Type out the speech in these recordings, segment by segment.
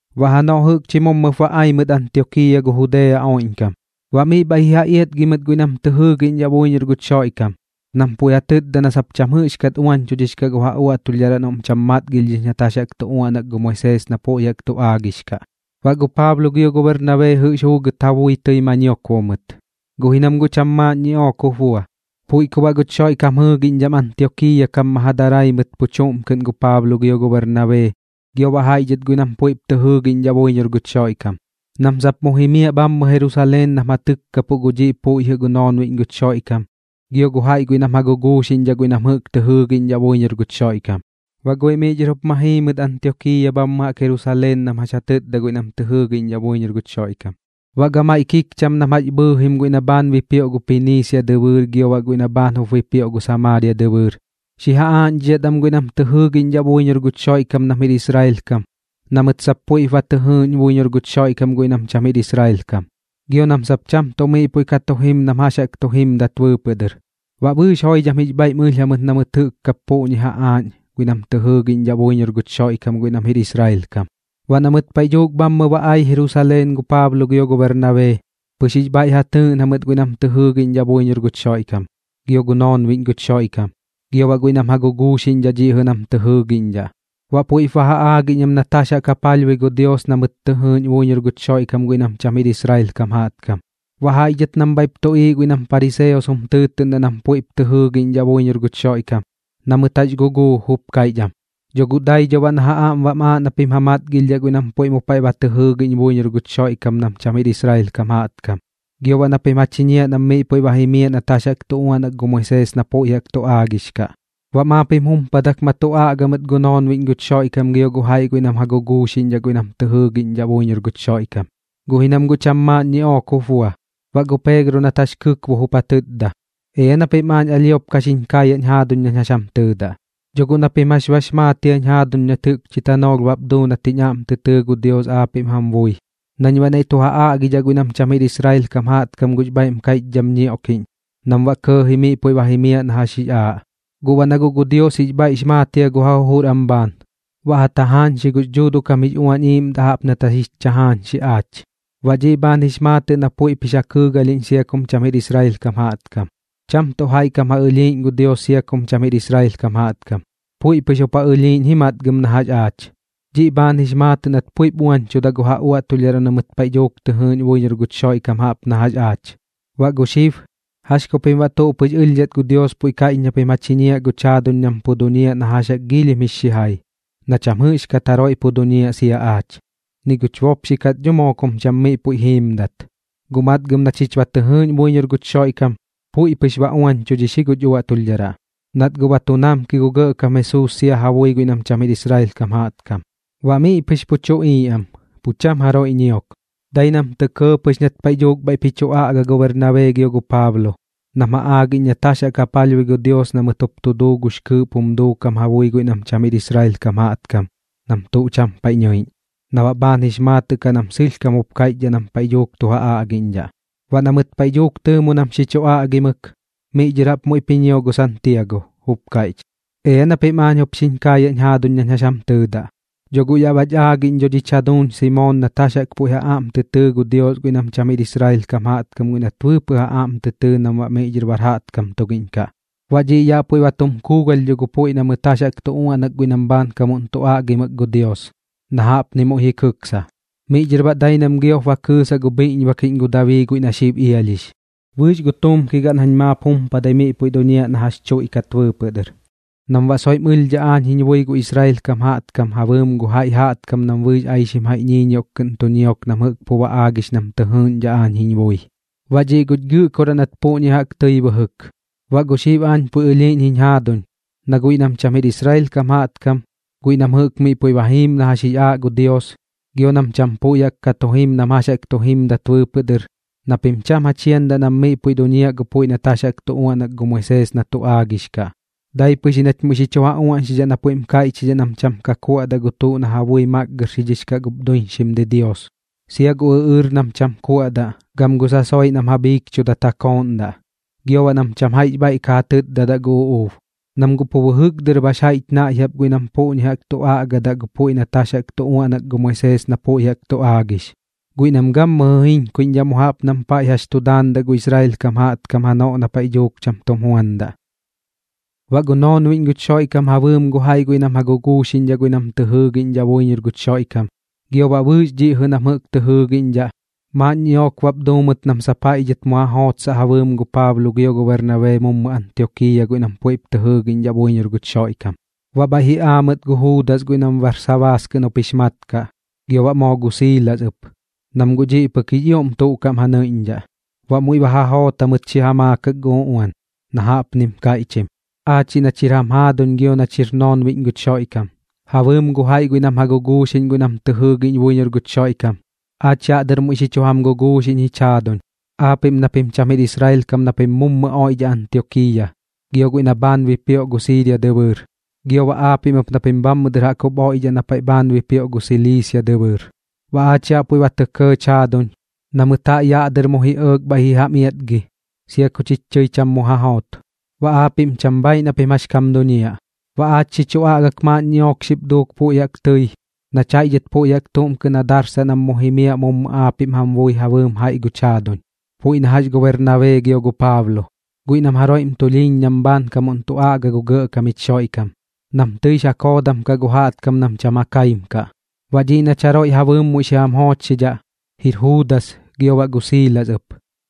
Baꞌ janoꞌ jɨꞌkchi mummɨp ba ai mɨt Antiokiiya gu Judea oiꞌñkam, baꞌ miꞌ bhaiꞌ ji ja iatgi mɨt guiꞌ nam tɨ jɨɨgiꞌñdhaꞌ buiñor guch Xoiꞌkam, nam puiꞌ ja tɨtda na sap cham jɨꞌxkat uañchudhix kaꞌ gu ja uaꞌtulhdharaꞌ noꞌm cham matgilhdhix nat jax jaꞌk tu uaꞌnak gu Moisees na puiꞌ jaꞌk tu aagix kaꞌ. Baꞌ gu Paablo gio gu Bernabee jɨꞌx juugɨt ja bui tɨi ma ñiokbo mɨt, guꞌ ji nam guꞌ cham maaꞌn ñiꞌook jup bua. Puiꞌ ku baꞌ guch Xoiꞌkam jɨɨgiꞌñdham Antiokiiya kam ma ja darai mɨt pu chuꞌm kɨꞌn gu Paablo gio gu Bernabee gio baꞌ jaiꞌ dhɨt guiꞌ nam puiꞌp tɨ jɨɨgiꞌñdhaꞌ buiñor guch Xoiꞌkam, nam sap mu jimiaꞌ bhammɨ Jerusaleen nam ja tɨkkapuꞌ gu dhiꞌ puiꞌ jɨꞌ gu noonbiꞌñ guch Xoiꞌkam gio gu jaiꞌ guiꞌ nam ja guguuxiꞌñdhaꞌ guiꞌ nam jɨꞌk tɨ jɨɨgiꞌñdhaꞌ buiñor guch Xoiꞌkam. Baꞌ guiꞌ miꞌ dhɨr jup ma jii mɨt Antiokiiya bhammɨ jaꞌk Jerusaleen nam jax ja tɨtda guiꞌ nam tɨ jɨɨgiꞌñdhaꞌ buiñor guch Xoiꞌkam. Baꞌ gamaiꞌ kikcham nam jax bhɨɨjim guiꞌ na bhaan bipioꞌ gu Piniisia dɨbɨɨr gio baꞌ guiꞌ na bhaan jup bipioꞌ gu Samaaria dɨbɨɨr, xi ja aaꞌñdhidhat am guiꞌ nam tɨ jɨɨgiꞌñdhaꞌ buiñor guch Xoiꞌkam nam jir Israel kam na mɨt sap puiꞌp ba tɨ jɨɨꞌñ buiñor gu Xoiꞌkam guiꞌ nam cham jir Israel kam, gio nam sap cham tuꞌ miꞌ puiꞌ ka tu jim nam jax jaꞌk tu jimdat bɨɨpɨꞌ dɨr. Baꞌ bɨɨx joidham jix bhaiꞌm ɨlh jamɨt na mɨt jɨꞌk kap puꞌñi ja aaꞌñ guiꞌ nam tɨ jɨɨgiꞌñdhaꞌ buiñor guch Xoiꞌkam guiꞌ nam jir Israel kam. Baꞌ na mɨt paiꞌ dhuuk bhammɨ ba ai Jerusaleen gu Paablo gio gu Bernabee, pɨx jix bhaiꞌ ja tɨɨꞌn jamɨt guiꞌ nam tɨ jɨɨgiꞌñdhaꞌ buiñor guch Xoiꞌkam, gio gu noonbiꞌñ guch Xoiꞌkam, gio baꞌ guiꞌ nam ja guguuxiꞌñdhaꞌ dhiꞌ jɨꞌ nam tɨ jɨɨgiꞌñdhaꞌ. Baꞌ puiꞌp ba ja aagiꞌñ am nat jax jaꞌk ja palhbui gu Dios na mɨt tɨ jɨɨꞌñ buiñor guch Xoiꞌkam guiꞌ nam cham jir Israel kam jaꞌtkam. Baꞌ jaiꞌ dhɨt nam bhaiꞌp tuꞌiiꞌ guiꞌ nam pariseos jum tɨɨtɨꞌndaꞌ nam puiꞌp tɨ jɨɨgiꞌñdhaꞌ buiñor guch Xoiꞌkam, na mɨt jax guguu jup kaiꞌch am: ―Dho dai dho baꞌ na ja aꞌm bam aaꞌ na pim ja matgilhdhaꞌ guiꞌ nam puiꞌ mu paiꞌ ba tɨ jɨɨgiꞌñ buiñor guch Xoiꞌkam nam cham jir Israel kam jaꞌtkam, gio baꞌ na pim ja chiñiaꞌ nam miꞌ puiꞌ jimiaꞌ nat jax jaꞌk tu uaꞌnak gu Moisees na puiꞌ jaꞌk tu aagix kaꞌ. Baꞌ maap jim jumpadak ma tu aꞌga mɨt gu noonbiꞌñ guch Xoiꞌkam gio gu jaiꞌ guiꞌ nam ja guguuxiꞌñ guiꞌ nam tɨ jɨɨgiꞌñdhaꞌ buiñor guch Xoiꞌkam, guꞌ ji nam guꞌ cham maaꞌn ñiꞌook jup bua. Baꞌ gu Peegro nat jax kɨkbo jup ja tɨtda: ―Ea na pim aañ alhiop ka xiñ kaayaꞌñ jaaduñ nañ jax jam tɨɨdaꞌ. Dho guꞌ na pim jax bax maat jia nat jɨꞌkchi tanoolh bap duu nat dɨr jiñ aꞌm tɨ tɨɨ gu Dios aapiꞌm jam bui nañ baꞌ naiꞌ tu ja aꞌgidhaꞌ guiꞌ nam cham jir Israel kam jaꞌtkam gux bhaiꞌm kaiꞌchdham ñioꞌkiꞌñ nam baꞌ kɇɇji miꞌ puiꞌ ba jimiaꞌ na jax jix aaꞌ. Guꞌ baꞌ na guꞌ gu Dios jix bhaiꞌx maat jia gu ja jujur am bhaan, baꞌ ja tajaañxi gux Dhuuduꞌ kam jix Uañ Iiꞌmdaꞌ jaꞌp nat jax jich tajaañxi aach. Baꞌ dhiꞌ bhaan jix maatɨꞌ na puiꞌp jix ja kɨɨgalhiꞌñ sia kum cham jir Israel kam jaꞌtkam. Cham tuꞌ jaiꞌ kam ja ɨlhiiꞌñ gu Dios sia kum cham jir Israel kam jaꞌtkam, puiꞌ pɨx jup ja ɨlhiiꞌñ ji matgɨm na jax aach. Dhiꞌ bhaan jix maatɨꞌ nat puiꞌp uañchuda gu ja uaꞌtulhdharaꞌ na mɨt paiꞌ dhuuk tɨ jɨɨꞌñ buiñor guch Xoiꞌkam jaꞌp na jax aach. Baꞌ gu xib, ¿jax ku pim baꞌ tuꞌ pɨx ɨlhdhat gu Dios puiꞌ kaiꞌch na pim ja chiñiaꞌ guch jaaduñ nam pu duñiaꞌ na jax jaꞌk giilhim jix xijai, na cham jɨꞌxkat jaroiꞌ pu duñiaꞌ sia aach, ni guch bopxi kat dho moo kum cham miꞌ puiꞌ jiimdat? Guꞌ matgɨm na chich ba tɨ jɨɨꞌñ buiñor guch Xoiꞌkam, puiꞌ pɨx ba uañchudhix ji guch uaꞌtulhdharaꞌ, nat guꞌ ba tu namki gu Gɇꞌkam Jesuus sia ja bui guiꞌ nam cham jir Israel kam jaꞌtkam. Baꞌ miꞌ pɨx pup tuꞌiiꞌ am, pu cham jaroiꞌ ñiok, dai nam tɇ kɇɇ pɨx nat paiꞌ dhuuk bhaiꞌp ji chu aꞌga gu Bernabee gio gu Paablo, nam ja aagiꞌñ nat jax jaꞌk ja palhbui gu Dios na mɨt jup tu duu gux kɨɨꞌp jum duukam ja bui guiꞌ nam cham jir Israel kam jaꞌtkam nam tuꞌ cham paiꞌ nɨiꞌñ, na baꞌ bhaan jix maatɨꞌ kaꞌ nam sɨlhkam jup kaiꞌchdhaꞌ nam paiꞌ dhuuk tu ja aꞌgiꞌñdhaꞌ. Baꞌ na mɨt paiꞌ dhuuk tɨɨmu nam xi chu aꞌgimɨk, miꞌ dhɨr jaꞌp muiꞌp ji ñio gu Santiago, jup kaiꞌch: ―Ea na pim aañ jup xiñ kaayaꞌñ jaaduñ nañ jax jam tɨɨdaꞌ. Dho guꞌ yaꞌ bach aagiꞌñ dho dhich jaduuñ Simoon nat jax jaꞌk puiꞌ ja aꞌm tɨ tɨɨ gu Dios guiꞌ nam cham jir Israel kam jaꞌtkam guiꞌ nat bɨɨpɨꞌ ja aꞌm tɨ tɨɨ nam baꞌ miꞌ dhɨr bar jaꞌtkam tugiꞌñ kaꞌ. Baꞌ dhiꞌ yaꞌ puiꞌ ba tum kuugalh dho gu puiꞌ na mɨt jax jaꞌk tu uaꞌnak guiꞌ nam bhaankamuꞌn tu aꞌgimɨk gu Dios, na jaꞌpni muiꞌ ji kɨksa: Miꞌ dhɨr baꞌ dai nañ giop ba kɨɨsaꞌ gu bhiꞌñbakiꞌñ gu Dabii guiꞌ na xib ialhix, bɨɨx gu tuumki gaꞌn jañ maap jumpadai miꞌ puiꞌ duñiaꞌ na jax tuiꞌkat bɨɨpɨꞌ dɨr, nam baꞌ soiꞌm ɨlhdhaꞌ aañ jiñ bui gu Israel kam jaꞌtkam ja bɨɨm gu jaiꞌ jaꞌtkam nam bɨɨx aixim jaiꞌ ñiiñioꞌk kɨꞌn tu ñiok nam jɨꞌk pu ba aagix nam tɨ jɨɨꞌñdhaꞌ aañ jiñ bui. Baꞌ dhiꞌ guch Gɨꞌkoraꞌ nat puꞌñi jaꞌk tɨi bɨjɨk. ’Baꞌ gu xib aañ puiꞌ ɨlhiiꞌñ jiñ jaaduñ na guiꞌ nam cham jir Israel kam jaꞌtkam, guiꞌ nam jɨꞌk miꞌ puiꞌ jimiim na jax jix aaꞌ gu Dios gio nam cham puiꞌ jaꞌk ka tu jim nam jax jaꞌk tu jimdat bɨɨpɨꞌ dɨr, na pim cham ja chiandaꞌ nam miꞌ puiꞌ duñiaꞌ gu puiꞌ nat jax jaꞌk tu uaꞌnak gu Moisees na tu aagix kaꞌ. Dai pɨx ji nach muiꞌ xi chu ja uaꞌñxidhaꞌ na puiꞌm kaiꞌchidhaꞌ nam cham ka tu kuaꞌdaꞌ gu tuꞌ na ja bui makgɨrxix kaꞌ gup duiñxim didios, sia gu ɨꞌɨɨr nam cham kuaꞌdaꞌ gam gu sasoiꞌ guiꞌ nam ja bhiikchudat ja kooꞌndaꞌ, gio baꞌ nam cham jaiꞌx bhaiꞌ ka ja tɨtdadaꞌ gu uꞌuub. Nam guꞌ pu bɨjɨk dɨr baꞌx jaiꞌch naiꞌ jaꞌp guiꞌ nam puꞌñi jaꞌk tu aꞌgadaꞌ gu puiꞌ nat jax jaꞌk tu uaꞌnak gu Moisees na puiꞌ jaꞌk tu aagix, guiꞌ nam gammɨjɨ jiñkuiꞌñdhaꞌ mu jaꞌp nam paiꞌ jax tu daandaꞌ gu Israel kam jaꞌtkam janoꞌ na paiꞌ dhuuk cham tum juandaꞌ. Baꞌ gu noonbiꞌñ guch Xoiꞌkam ja bɨɨm gu jaiꞌ guiꞌ nam ja guguuxiꞌñ guiꞌ nam tɨ jɨɨgiꞌñdhaꞌ buiñor guch Xoiꞌkam, gio baꞌ bɨɨx dhiꞌ jɨꞌ nam jɨꞌk tɨ jɨɨgiꞌñdhaꞌ, maaꞌn ñiꞌook bap duu mɨt nam sap jaiꞌ dhɨt mu ja jootsaꞌ ja bɨɨm gu Paablo gio gu Bernabee mummɨ Antiokiiya guiꞌ nam puiꞌp tɨ jɨɨgiꞌñdhaꞌ buiñor guch Xoiꞌkam. Baꞌ bhaiꞌ ji aa mɨt gu Juudas guiꞌ nam Barsabaas kɨꞌn jup jix mat kaꞌ, gio baꞌ moo gu Siilas ɨp, nam guꞌ dhiꞌ pɨk jix ioꞌm tuꞌ kaꞌm ja nɨiꞌñdhaꞌ. Baꞌ muiꞌ ba ja joot jamɨt xi ja maakak gu uꞌuan, na jaꞌpnim kaiꞌchim: “Aachiꞌ nach jir jam jaaduñ gio nach jir noonbiꞌñ guch Xoiꞌkam, ja bɨɨm gu jaiꞌ guiꞌ nam ja guguuxiꞌñ guiꞌ nam tɨ jɨɨgiꞌñ buiñor guch Xoiꞌkam, aach yaꞌ dɨr muiꞌ xi chu jam guguuxiꞌñ jich jaaduñ, aapiꞌm na pim cham jir Israel kam na pim mummɨ oiꞌdhaꞌ Antiokiiya, gio guiꞌ na bhaan bipioꞌ gu Siiria dɨbɨɨr, gio baꞌ aapiꞌm ɨp na pim bhammɨ dɨr jaꞌk jup oiꞌdhaꞌ na paiꞌ bhaan bipioꞌ gu Siliisia dɨbɨɨr. Baꞌ aach yaꞌ puiꞌ ba tɇ kɇɇch jaaduñ, na mɨt jaiꞌ dhɨt yaꞌ dɨr mummɨ ji ɇɇk bhaiꞌ ji jam iatgi, sia ku chich tɨi cham mu ja joot. Baꞌ aapiꞌm cham bhaaiꞌ na pim jax kam duñiaꞌ. Baꞌ aach xi chu aꞌgak maaꞌn ñiꞌook xip duuk puiꞌ jaꞌk tɨi nach jaiꞌ dhɨt puiꞌ jaꞌk tuꞌm kɨꞌn ja darsaꞌ nam mu jimiaꞌ mummɨ aapiꞌm jam bui ja bɨɨm jaiꞌ guch jaaduñ, puiꞌ na jax gu Bernabee gio gu Paablo, guiꞌ nam jaroiꞌm tulhiiñ nam bhaankamuꞌn tu aꞌga gu Gɇꞌkam jich Xoiꞌkam, nam tɨix ja koodam kaꞌ gu jaꞌtkam nam cham ja kaim kaꞌ. Baꞌ dhiꞌ nach jaroiꞌ ja bɨɨm muiꞌ xi jam joochxidhaꞌ, jir Juudas gio baꞌ gu Siilas ɨp,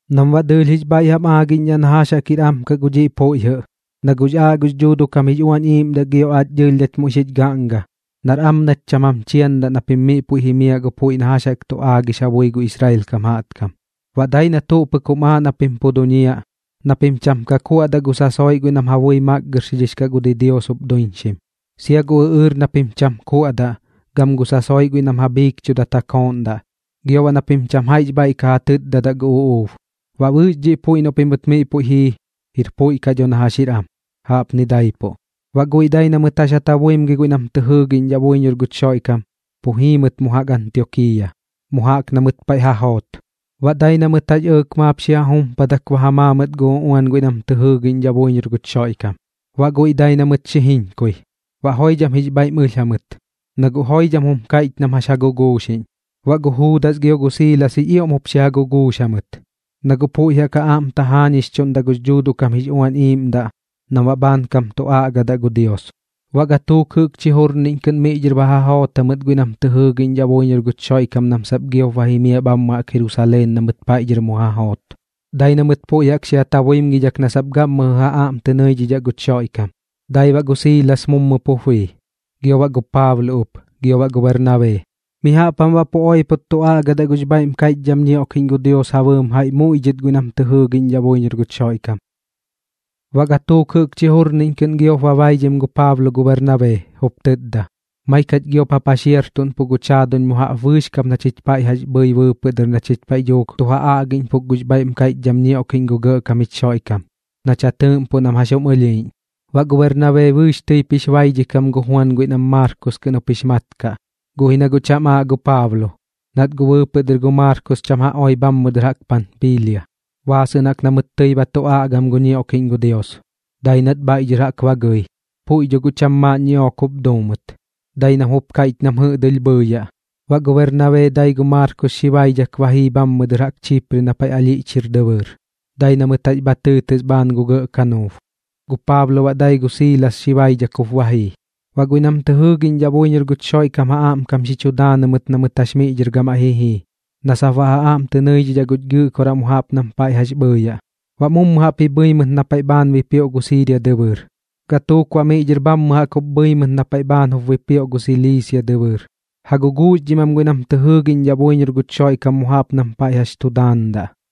nam baꞌ dɨɨlh jix bhaiꞌ jam aagiꞌñdhaꞌ na jax jaꞌk jir am gu dhiꞌ puiꞌ jɨꞌ. Na guꞌx aaꞌ gux Dhuuduꞌ kam jix Uañ Iiꞌmdaꞌ gio aach dɨɨlh nach muiꞌ xich gaꞌnga, nar am nach cham jam chiandaꞌ na pim miꞌ puiꞌ jimiaꞌ gu puiꞌ na jax jaꞌk tu aagix ja bui gu Israel kam jaꞌtkam. Baꞌ dai na tuꞌ pɨk jum aaꞌ na pim pu duñiaꞌ, na pim cham ka ja kuaꞌdaꞌ gu sasoiꞌ guiꞌ nam ja bui makgɨrxix kaꞌ gu didios jup duiñxim, sia gu ɨꞌɨɨr na pim cham kuaꞌdaꞌ gam gu sasoiꞌ guiꞌ nam ja bhiikchudat ja kooꞌndaꞌ, gio baꞌ na pim cham jaiꞌx bhaiꞌ ka ja tɨtdadaꞌ gu uꞌuub. Baꞌ bɨɨx dhiꞌ puiꞌ noꞌ pimɨt miꞌ puiꞌ jii, jir puiꞌ kaꞌ dho na jax jir am. Jaꞌpni daipuꞌ.” Baꞌ guiꞌ dai na mɨt jax ja tabuimgi guiꞌ nam tɨ jɨɨgiꞌñdhaꞌ buiñor guch Xoiꞌkam pu jii mɨt mu jaꞌk Antiokiiya, mu jaꞌk na mɨt paiꞌ ba ja joot. Baꞌ dai na mɨt jax ɇɇk maap xi ja jumpadak ba ja maa mɨt gu uꞌuan guiꞌ nam tɨ jɨɨgiꞌñdhaꞌ buiñor guch Xoiꞌkam. Baꞌ guiꞌ dai na mɨt xi jiñkui, baꞌ joidham jix bhaiꞌm ɨlh jamɨt, na guꞌ joidham jum kaiꞌch nam jax ja guguuxiꞌñ. Baꞌ gu Juudas gio gu Siilas jix ioꞌm jup xi ja guguux jamɨt, na guꞌ puiꞌ jaꞌk ja aꞌm tajaañixchuꞌndaꞌ gux Dhuuduꞌ kam jix Uañ Iiꞌmdaꞌ nam baꞌ bhaankam tu aꞌgadaꞌ gu Dios. Baꞌ gatuuk jɨꞌkchi jurniꞌñ kɨꞌn miꞌ dhɨr ba ja joot jamɨt guiꞌ nam tɨ jɨɨgiꞌñdhaꞌ buiñor guch Xoiꞌkam nam sap giop ba jimiaꞌ bhammɨ jaꞌk Jerusaleen na mɨt paiꞌ dhɨr mu ja joot, dai na mɨt puiꞌ jaꞌk xi ja tabuimgidhak na sap gammɨjɨ ja aꞌm tɨ nɨidhidhaꞌ guch Xoiꞌkam. Dai baꞌ gu Siilas mummɨ pup bii, gio baꞌ gu Paablo ɨp gio gu Bernabee, mi jaꞌp jam baꞌ pu oipot tu aꞌgadaꞌ gux bhaiꞌm kaiꞌchdham ñioꞌkiꞌñ gu Dios ja bɨɨm jaiꞌ muiꞌ dhɨt guiꞌ nam tɨ jɨɨgiꞌñdhaꞌ buiñor guch Xoiꞌkam. Baꞌ gatuuk jɨꞌkchi jurniꞌñ kɨꞌn giop ba baidhim gu Paablo gu Bernabee, jup tɨtda: ―Maik jach giop ja paxiartuꞌnpuꞌ guch jaaduñ mu jaꞌp bɨɨx kap na chich paiꞌ jax bhɨi bɨɨpɨꞌ dɨr na chich paiꞌ dhuuk tu ja aꞌgiꞌñpuk gux bhaiꞌm kaiꞌchdham ñioꞌkiꞌñ gu Gɇꞌkam jich Xoiꞌkam, nach ja tɨɨꞌmpuꞌ nam jax jum ɨlhiiꞌñ. Baꞌ gu Bernabee bɨɨx tɨip jix baidhikam gu Juan guiꞌ nam Maarkos kɨꞌn jup jix mat kaꞌ. Guꞌ ji na guꞌ cham aaꞌ gu Paablo, nat guꞌ bɨɨpɨꞌ dɨr gu Maarkos cham ja oi bhammɨ dɨr Panpiilia, baasɨꞌn jaꞌk na mɨt tɨi ba tu aꞌgam gu ñioꞌkiꞌñ gu Dios, dai nat bhaiꞌ dhɨr jaꞌk ba gɨi. Puiꞌ dho guꞌ cham maaꞌn ñiꞌook jup duu mɨt, dai nam jup kaiꞌch nam jɨꞌdɨlh bhɨɨyaꞌ. Baꞌ gu Bernabee dai gu Maarkos xi baidhak ba jii bhammɨ dɨr jaꞌk Chipre na paiꞌ alhiꞌch jir dɨbɨɨr, dai na mɨt jax bha tɨɨtɨs bhaan gu gɇꞌ kanuub. Gu Paablo baꞌ dai gu Siilas xi baidhak jup ba jii. Baꞌ guiꞌ nam tɨ jɨɨgiꞌñdhaꞌ buiñor guch Xoiꞌkam ja aꞌmkam xi chu daanɨ mɨt na mɨt jax miꞌ dhɨr gamaiꞌ ji jii na sap baꞌ ja aꞌm tɨ nɨidhidhaꞌ guch Gɨꞌkoraꞌ mu jaꞌp nam paiꞌ jax bhɨɨyaꞌ. Baꞌ mummɨ jaꞌp ji bhɨi mɨt na paiꞌ bhaan bipioꞌ gu Siiria dɨbɨɨr, gatuuk baꞌ miꞌ dhɨr bhammɨ dɨr jaꞌk jup bhɨi mɨt na paiꞌ bhaan jup bipioꞌ gu Siliisia dɨbɨɨr, ja guguuxdhim am guiꞌ nam jɨꞌk tɨ jɨɨgiꞌñdhaꞌ buiñor guch Xoiꞌkam mu jaꞌp nam paiꞌ jax tu daandaꞌ.